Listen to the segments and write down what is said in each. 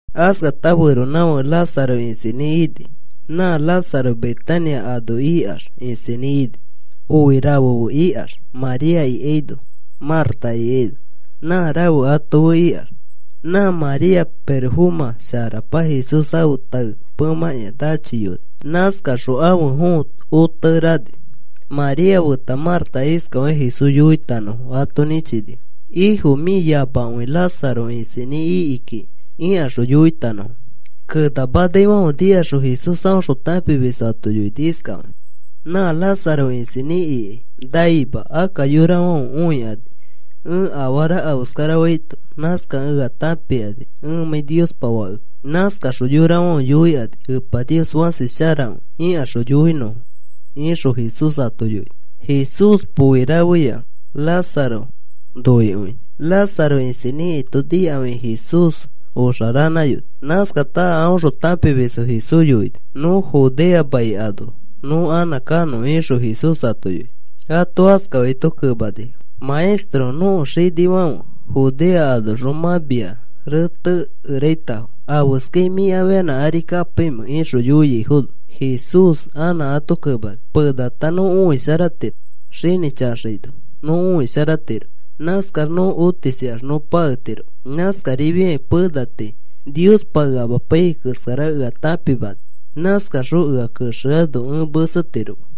Askata feronãfake Lázaro isinĩ ini. Nã Lázaro Betania ano ikax isinĩ ini. Poi rafe fe ikax María ikaino, Marta ikaino, nã rafe ato fe ikax. Nã María pirofomã sharakapa Jesús ãfe tae pemãkĩa nachiyoni. Nãskaxõ ãfe fõo otekere ani. María feta Marta iskafakĩ Jesús yoitanõfo ato nĩchini: “Ifo, mĩ yamakõi Lázaro isinĩ iki kiki,” ikaxõ yoitanõfo. Kenamanaifãfe nikaxõ Jesús aõxõ tãpimisfo ato yoini iskafakakĩ: “Nã Lázaro isinĩ ikai naima. Akka yorafãfe õikani ẽ afara afeskarafaito. Nãskakẽ ea tãpikani ẽmãi Niospa Fakekẽ. Nãskaxõ yorafãfe yoikani: ‘Epa Nios fãsi sharakõi,’ ikaxõ yoinõfo,” ixõ Jesús ato yoini. Jesús poi rafeya Lázaro noikõini. Lázaro isinĩ ikaito nikafi Jesús oxa rafeyoni. Nãskata a aõxõ tãpimisfo Jesús yoini: “Nõ Judea mai ano nõ anã kanõ,” ixõ Jesús ato yoini. Ato askafaito kemanifo: “Maestro, nõko xanĩfofãfe Judea anoxõ mã mia retekeraitafo. ¿Afeskai mĩ afianã ari kapaimẽ?” ixõ yoiaifono, Jesús anã ato kemani: “Penata nõ õisharatiro. Xinĩ chaxaino nõ õisharatiro. Nãskax nõ otisikax nõ paketiroma. Nãskarifiakĩ pena tii Niospa ea amapaiyai keskara ea tãpimani. Nãskaxõ ea kexeano ẽ mesetiroma.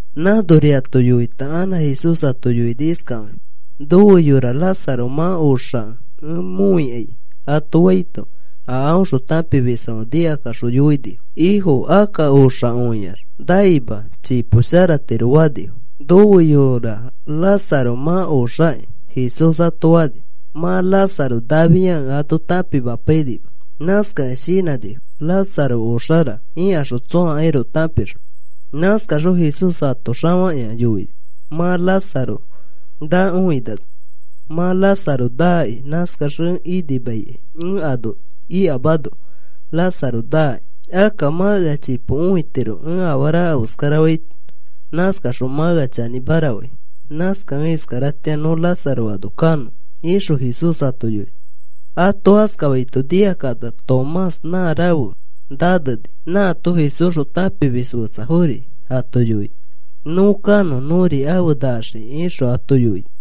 Nãnori ato yoita anã Jesús ato yoini iskafakĩ: “Nofe yora Lázaro mã oxakẽ ẽ mõikai,” ato faito, a aõxõ tãpimisfãfe nikakaxõ yoinifo: “Ifo, akka oxakõiax naima. Chipo sharatiro,” fanifo. “Nofe yora Lázaro mã oxaki,” Jesús ato fani. Mã Lázaro nafiakẽ ato tãpimapainima. Nãskakẽ shinãnifo: “Lázaro oxara,” ikaxõ tsõakairoko tãpixõ. Nãskaxõ Jesús ato xafakĩa yoini mã Lázaro nakõinano: “Mã Lázaro naki. Nãskax ẽ inimaikai ẽ ano ikamano Lázaro naki. Akka mã ea chipo õitiro ẽ afara afeskarafaito. Nãskaxõ mã ea chanĩmara fai. Nãskakẽ iskaratĩa nõ Lázaro ano kanõ,” ixõ Jesús ato yoini. Ato askafaito nikakata Tomás nã Rafe Naneni nãato Jesúsxõ tãpimis fetsafori ato yoini: “Nõ kanõ nõri afe naxikĩ,” ixõ ato yoini.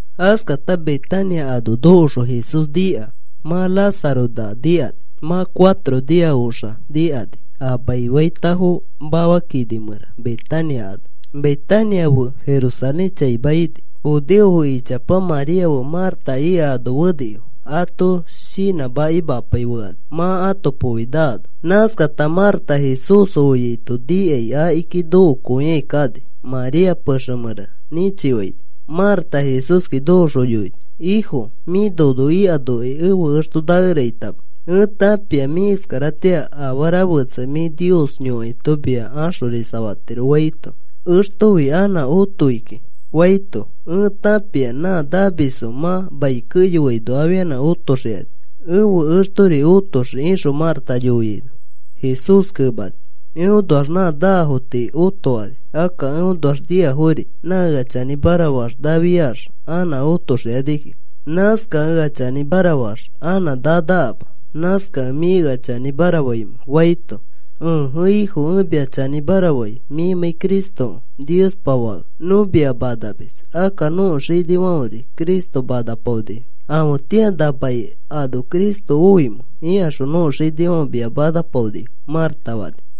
Askata Betania ano nokoxõ Jesús nika: “Mã Lázaro naa,” nikani. Mã cuatro nia oxa nikani a maifaitafo mafa kini mẽra, Betania ano. Betania fe Jerusalén chaima ini. judeofo ichapa María fe Marta ika ano fenifo ato ferarofai fekani, mã ãto poi naano. Nãskata Marta Jesús oaito nikai akiki nokoikai kani María pexe mẽra nĩchifaini. Marta Jesúski nokoxõ yoini: “Ifo, mĩ nono ikanokai ẽfe exto nakeraitama. Ẽ tãpia mĩ iskaratĩa afara fetsa mĩ Nios yõkaito mia axorisafatirokĩ,” faito, “Extofi anã otoi kiki,” faito, “Ẽ tãpia nã namisfo mã mai keyoaino afianã otoxikani. Ẽfe extori otoxii,” ixõ Marta yoiaino, Jesús kemani: “Eõnoax nã nafo tii otokani. Akka eõnoax niafori. Nã ea chanĩmara faax nafiax anã otoxii kiki. Nãskakẽ ea chanĩmara faax anã nanakama. ¿Nãskakẽ mĩ ea chanĩmara faimẽ?” faito, “Ẽje, Ifo, ẽ mia chanĩmara fai mĩmãi Cristokẽ, Niospa fake. Nõ mia manamis. Akka nõko xinifãferi Cristo manapaonifo. ‘¿Afetĩa na mai ano Cristo oimẽ?’ ikaxõ nõko xinifãfe mia manapaonifo,” Marta fani.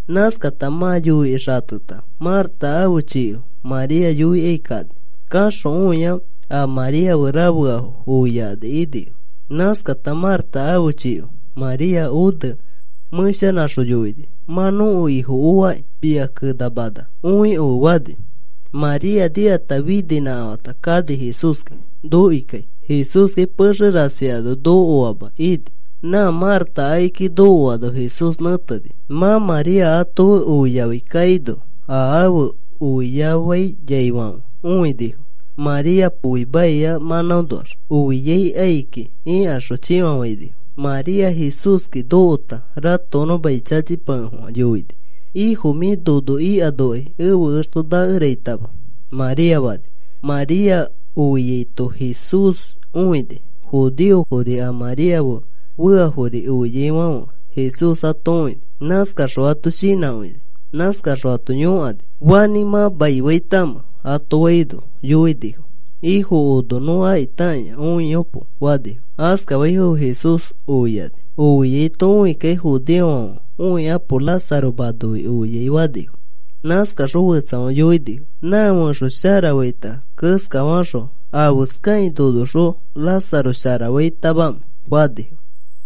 Nãskata mã yoikĩ xateta, Marta ãfe chiko María yoikai kani. Kaxõ õia a María fe rafeafo oiyakani inifo. Nãskata Marta ãfe chiko María one mẽshanãxõ yoini: “Mã nõko Ifo oaki. Mia kenamana, õikofe,” fani. María nikata fininãkafãta kani Jesúski nokoikai. Jesúskai pexe rasi ano nokoama ini. Nã Marta akiki nokoano Jesús nẽteni. Mã María ato fe oiafai kaino a afe oiafaiyaifãfe õinifo. “María poi maia mãnãonoax oiai kai kiki,” ikaxõ chĩfafainifo. María Jesúski nokota ratokonõ mai chachipakefofã yoini: “Ifo, mĩ nono ikanokai ẽfe exto nakeraitama,” María fani. María oiaito Jesús õini. Judeofori a María fe feafori oiaifãfe Jesús ato õini. Nãskaxõ ato shinãkõini. Nãskaxõ ato yõkani: “¿Fanĩ mã maifaitamẽ?” ato faino, yoinifo: “Ifo, ono nõ akitakĩa õiyopo,” fanifo. Askafaifono Jesús oiani. Oiaito õikakĩ judeofãfe: “Õikapo. Lázaro manoi oiai,” fanifo. Nãskaxõ fetsafãfe yoinifo: “Nã fẽxo sharafaita keskafaxõ, ¿afeskafakĩ nonoxõ Lázaro sharafaitamamẽ?” fanifo.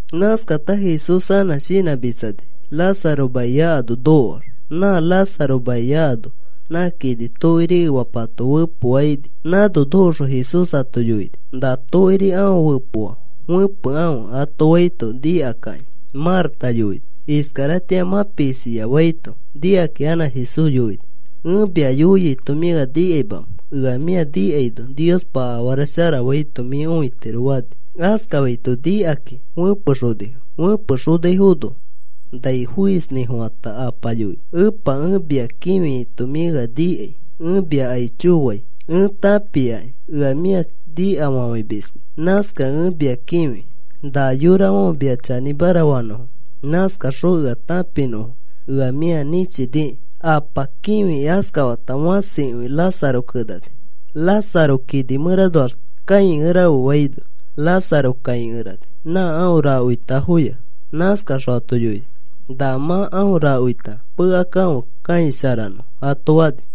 Nãskata Jesús anã shinãmitsani Lázaro maia ano nokoax. Nã Lázaro maia ano nã kini tokiri efapato fepoafo ini. Nãno nokoxõ Jesús ato yoini: “Na tokiri aõ fepoa fepekãfe,” ato faito, nikakĩ Marta yoini: “Iskaratĩa mã pisiaki,” faito, nikakĩ anã Jesús yoini: “¿Ẽ mia yoiaito mĩ ea nikaimamẽ? Ea mĩa nikaino Niospa afara shara faito mĩ õitiro,” fani. Askafaito nikakakĩ fẽpexonifo. Fẽpexonaifono nai foisnĩfofãta Apa yoini: “Epa, ẽ mia kĩfiaito mĩ ea nikai. Ẽ mia aicho fai. Ẽ tãpiaki ea mĩa nikafafãimiskĩ. Nãskakĩ ẽ mia kĩfi na yorafãfe mia chanĩmara fanõfo. Nãskakaxõ ea tãpinõfo ea mĩa nĩchiniki.” Apa kĩfikĩ askafata fãsikõi Lázaro kenani: “Lázaro, kini mẽranoax kãikerafe,” faino, Lázaro kãikerani nã aõ rakoitafoya. Nãskaxõ ato yoini: “Na mã aõ rakoita pekakãfe kãisharanõ,” ato fani.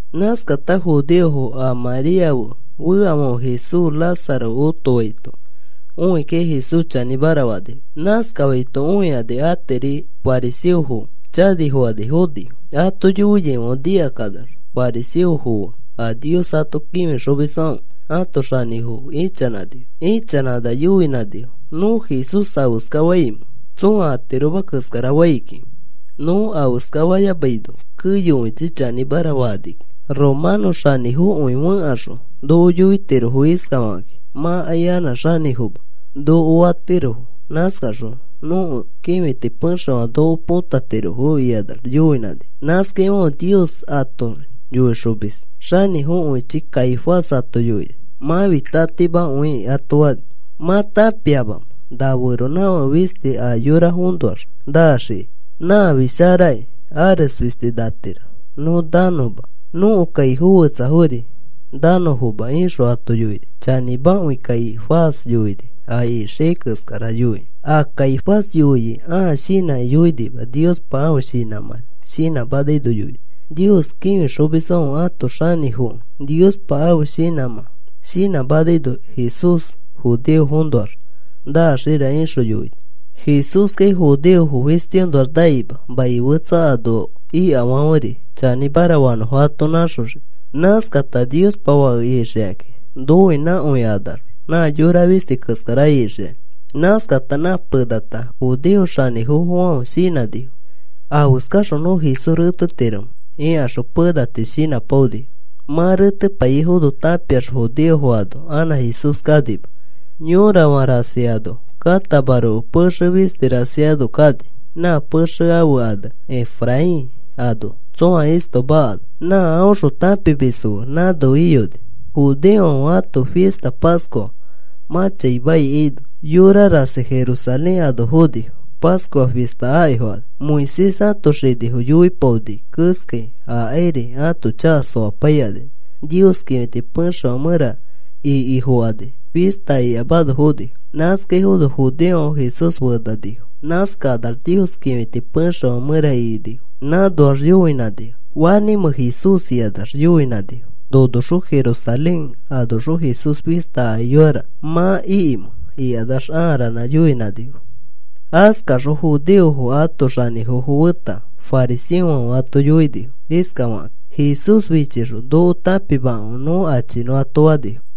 Nãskata judeofo a María fe feafãfe Jesús Lázaro otofaito õikakĩ Jesús chanĩmara fanifo. Nãskafaito õikani atiri fariseofoki chanifokani fonifo. Ato yoiaifãfe nikakanax fariseofo fe a Nios ato kĩfixomisfãfe ãto xanĩfofo ichanãnifo. Ichanãkanax yoinãnifo: “¿Nõ Jesús afeska faimẽ? Tsõa atiroma keskara fai kiki. Nõ afeskafayamaino keyokõichi chanĩmara fakani kiki. Romano xanĩfokõifo fẽkaxõ noko yoitirofo iskafakakĩ: ‘Mãkai anã xanĩfoma,’ noko fatirofo. Nãskaxõ nõko kĩfiti pexefã noko põtatirofo,” ikanax yoinãnifo. Nãskaifãfe Nios ato yoixomis xanĩfokõichi Caifás ato yoini: “Mãfi tatimakõikĩ,” ato fani. “¿Mã tãpiamamẽ? na feronãfake fisti a yorafoõnoax naxiai. Nãfi sharaki. Ares fisti natiro nõ nanõma, nõko kaifo fetsafori nanõfoma,” ixõ ato yoini. Chanĩmakõi Caifás yoini a ixiai keskara yoikĩ. A Caifás yoiai ãa shinãkĩ yoinima. Niospa ãfe shinãmã shinãmanaino yoini. Nios kĩfixomisfãfe ãto xanĩfokẽ Niospa ãfe shinãmã shinãmanaino, “Jesús judeofonoax naxira,” ixõ yoini. Jesúskai judeofo fistiõnoax naima. Mai fetsa ano ikafãferi chanĩmara faafono ato nãxoxii. Nãskata Niospa fake ixikakĩ noinãkõikanax, nã yora fisti keskara ixikaki. Nãskata nã penata judeo xanĩfofofãfe shinãnifo: “¿Afeskaxõ nõ Jesús retetiromẽ?” ikaxõ pena tii shinãpaonifo. Mã retepaiyaifono tãpiax judeofo ano anã Jesús kanima. Yorafã rasi ano katamaroko pexe fisti rasi ano kani, nã pexe ãfe ane Efraín ano, tsõa istoma ano. Nã aõxõ tãpimisfo fe nãno iyoni. Judeofãfe ãto fista Pascua mã chaima ikaino, yora rasi Jerusalén ano fonifo, Pascua fista akifokani. Moisés ãto xinifo yoipaoni keskai akairi ãto chaka soapaikani Nios kĩfiti pexefã mẽra ikifokani, fista ikamano fonifo. Nãskaifono judeofãfe Jesús fenanifo. Nãskakanax Nios kĩfiti pexefã mẽra ikinifo. Nãnoax yoinãnifo: “¿Fanĩmẽ Jesús?” ikanax yoinãnifo. “ ‘Nonoxõ Jerusalén anoxõ Jesús fista akiyoira,’ ¿mã ikimẽ?” ikanax aa ranã yoinãnifo. Askakaxõ judeofo ãto xanĩfofo feta fariseofãfe ato yoinifo iskafakakĩ: “Jesús fichixõ noko tãpimakãfe nõ achinõ,” ato fanifo.